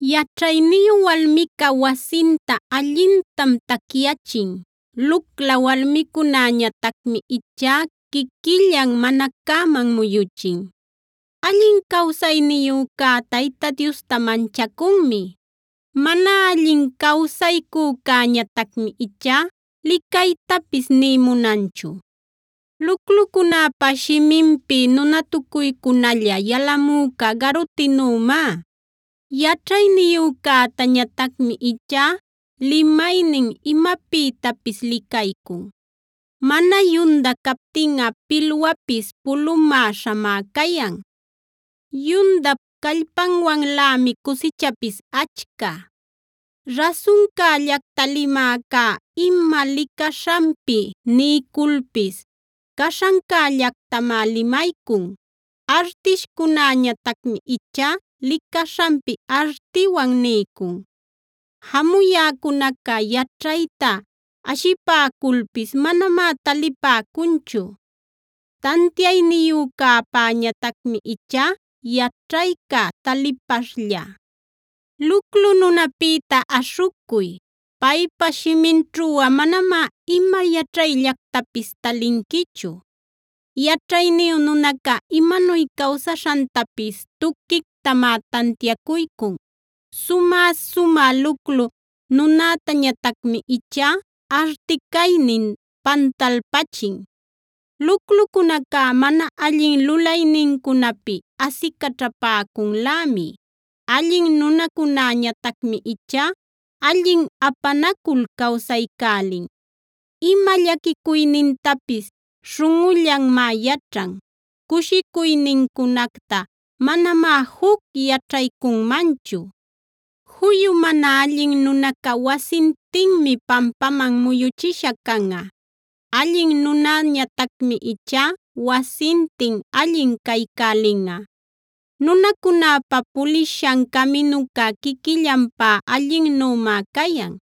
Yaćhayniyu walmica wasinta allintam tacyachin; lucla walmicunäñatacmi ichá quiquillan mana cäman muyuchin. Allin cawsayniyücá Tayta Diosta manchacunmi; mana allin cawsaycücäñatacmi ichá licaytapis nï munanchu. Luclucunäpa shiminpi nunatucuycunalla yalamüca garutinümá; yaćhayniyücätañatacmi ichá limaynin imapïtapis licaycun. Mana yunda captinꞌa pilwapis pulumäśhamá cayan; yundap callpanwanlämi cusichapis achca. Rasuncällacta limäcá ima licaśhanpi niyculpis caśhancällactamá limaycun; artishcunäñatacmi ichá licaśhanpi artinwan niycun. Jamuyäcunaca yaćhayta ashipäculpis manamá talipäcunchu; tantiayniyücäpäñatacmi ichá yaćhayca talipaśhlla. Luclu nunäpïta aśhucuy; paypa shiminćhuꞌa manamá ima yaćhayllactapis talinquichu. Yaćhayniyu nunacá imanuy cawsaśhantapis tuquictamá tantiacuycun; sumä-sumä luclu nunätañatacmi ichá arti caynin pantalpachin. Luclucunacá mana allin lulaynincunapi asicaćhapäcunlämi; allin nunacunäñatacmi ichá allin apanacul cawsaycälin. Ima llaquicuynintapis śhunꞌullanmá yaćhan; cushicuynincunacta manamá juc yaćhaycunmanchu. Juyu mana allin nunaca wasintinmi pampaman muyuchisha canꞌa; allin nunäñatacmi ichá wasintin allin caycälinꞌa. Nunacunäpa pulishan caminuca quiquillanpá allinnümá cayan;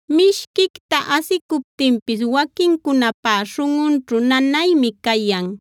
Mishquicta asicuptinpis waquincunapá śhunꞌunćhu nanaymi cayan;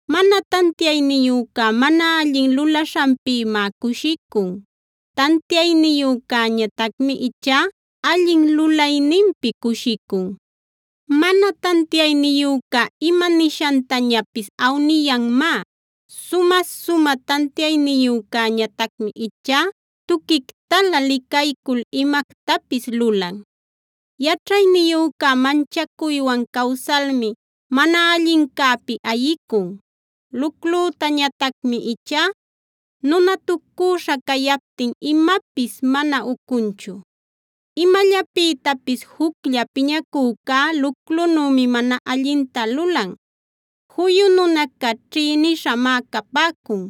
Mana tantiayniyüca mana allin lulaśhanpïmá cushicun; tantiayniyücäñatacmi ichá allin lulayninpi cushicun. Mana tantiayniyüca ima nishantañapis awniyanmá; sumä-sumä tantiayniyücäñatacmi ichá tuquictalä licaycul imactapis lulan. Yaćhayniyüca manchacuywan cawsalmi mana allincäpi ayicun; luclütañatacmi ichá nunatucüśha cayaptin imapis mana ucunchu. Imallapïtapis juclla piñacücá luclunümi mana allinta lulan; juyu nunaca ćhïnishamá capäcun.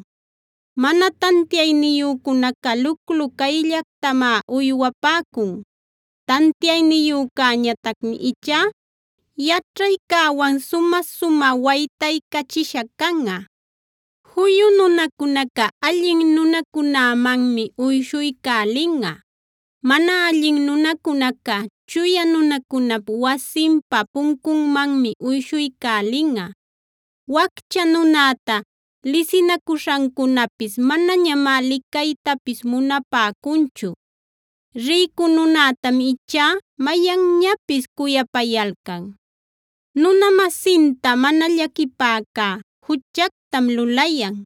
Mana tantiayniyücunaca luclu cayllactamá uywapäcun; tantiayniyücäñatacmi ichá yaćhaycäwan sumä-sumä waytaycachisha canꞌa. Juyu nunacunaca allin nunacunämanmi uyshuycälinꞌa; mana allin nunacunaca chuya nunacunap wasinpa puncunmanmi uyshuycälinꞌa. Waccha nunäta lisinacuśhancunapis manañamá licaytapis munapäcunchu; rïcu nunätam ichá mayanñapis cuyapayalcan. Nuna-masinta mana llaquipäcá juchactam lulayan;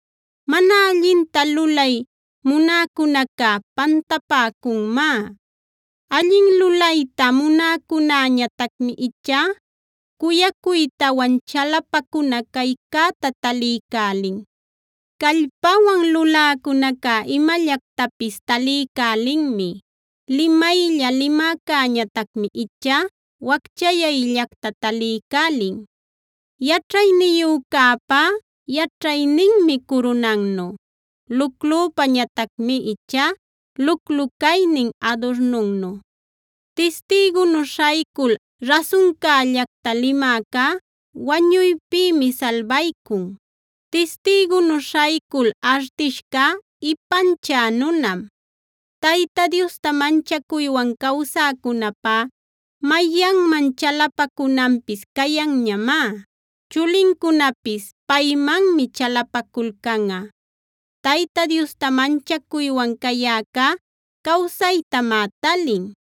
Mana allinta lulay munäcunaca pantapäcunmá; allin lulayta munäcunäñatacmi ichá cuyacuytawan chalapacuna caycäta taliycälin. Callpanwan luläcunacá imallactapis taliycälinmi; limaylla-limäcäñatacmi ichá wacchayayllacta taliycälin. Yaćhayniyücäpá yaćhayninmi curunannu; luclüpañatacmi ichá luclu caynin adurnunnu. Tistïgunu śhaycul rasuncällacta limäcá wañuypïmi salbaycun; tistïgunu śhaycul artishcá ipanchä nunam. Tayta Diosta manchacuywan cawsäcunäpá mayanman chalapacunanpis cayanñamá; chulincunapis paymanmi chalapaculcanꞌa. Tayta Diosta manchacuywan cayäcá cawsaytamá talin,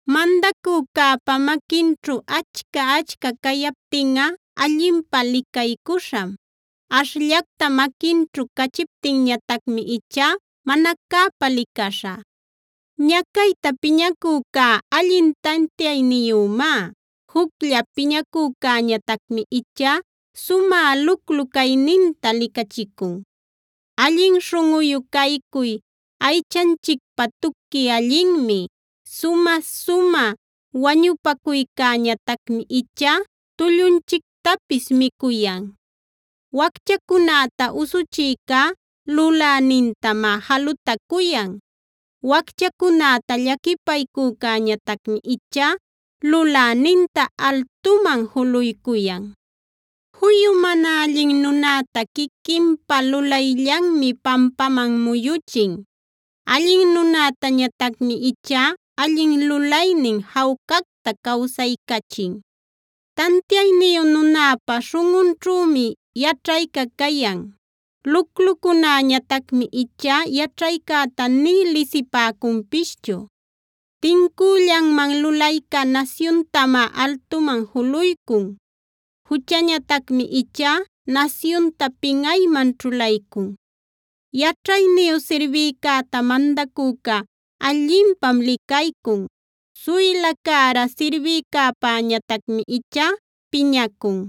Mandacücäpa maquinćhu achca-achca cayaptinꞌa allinpä licaycuśham; ashllacta maquinćhu cachiptinñatacmi ichá mana cäpa licaśha. Ñacayta piñacücá allin tantiayniyümá; juclla piñacücäñatacmi ichá sumä luclu cayninta licachicun. Allin śhunꞌuyu caycuy aychanchicpä tuqui allinmi; sumä-sumä wañupacuycäñatacmi ichá tullunchictapis micuyan. Wacchacunäta usuchïcá Lulänintamá jalutacuyan; wacchacunäta llaquipaycücäñatacmi ichá Luläninta altuman juluycuyan. Juyu mana allin nunäta quiquinpa lulayllanmi pampaman muyuchin; allin nunätañatacmi ichá allin lulaynin jawcactae cawsaycachin. Tantiayniyu nunäpa śhunꞌunćhümi yaćhayca cayan; luclucunäñatacmi ichá yaćhaycäta nï lisipäcunpischu. Tincüllanman lulayca nasyuntamá altuman juluycun; juchañatacmi ichá nasyunta pinꞌayman ćhulaycun. Yaćhayniyu sirbïcäta mandacüca allinpam licaycun; suyla cära sirbïcäpäñatacmi ichá piñacun.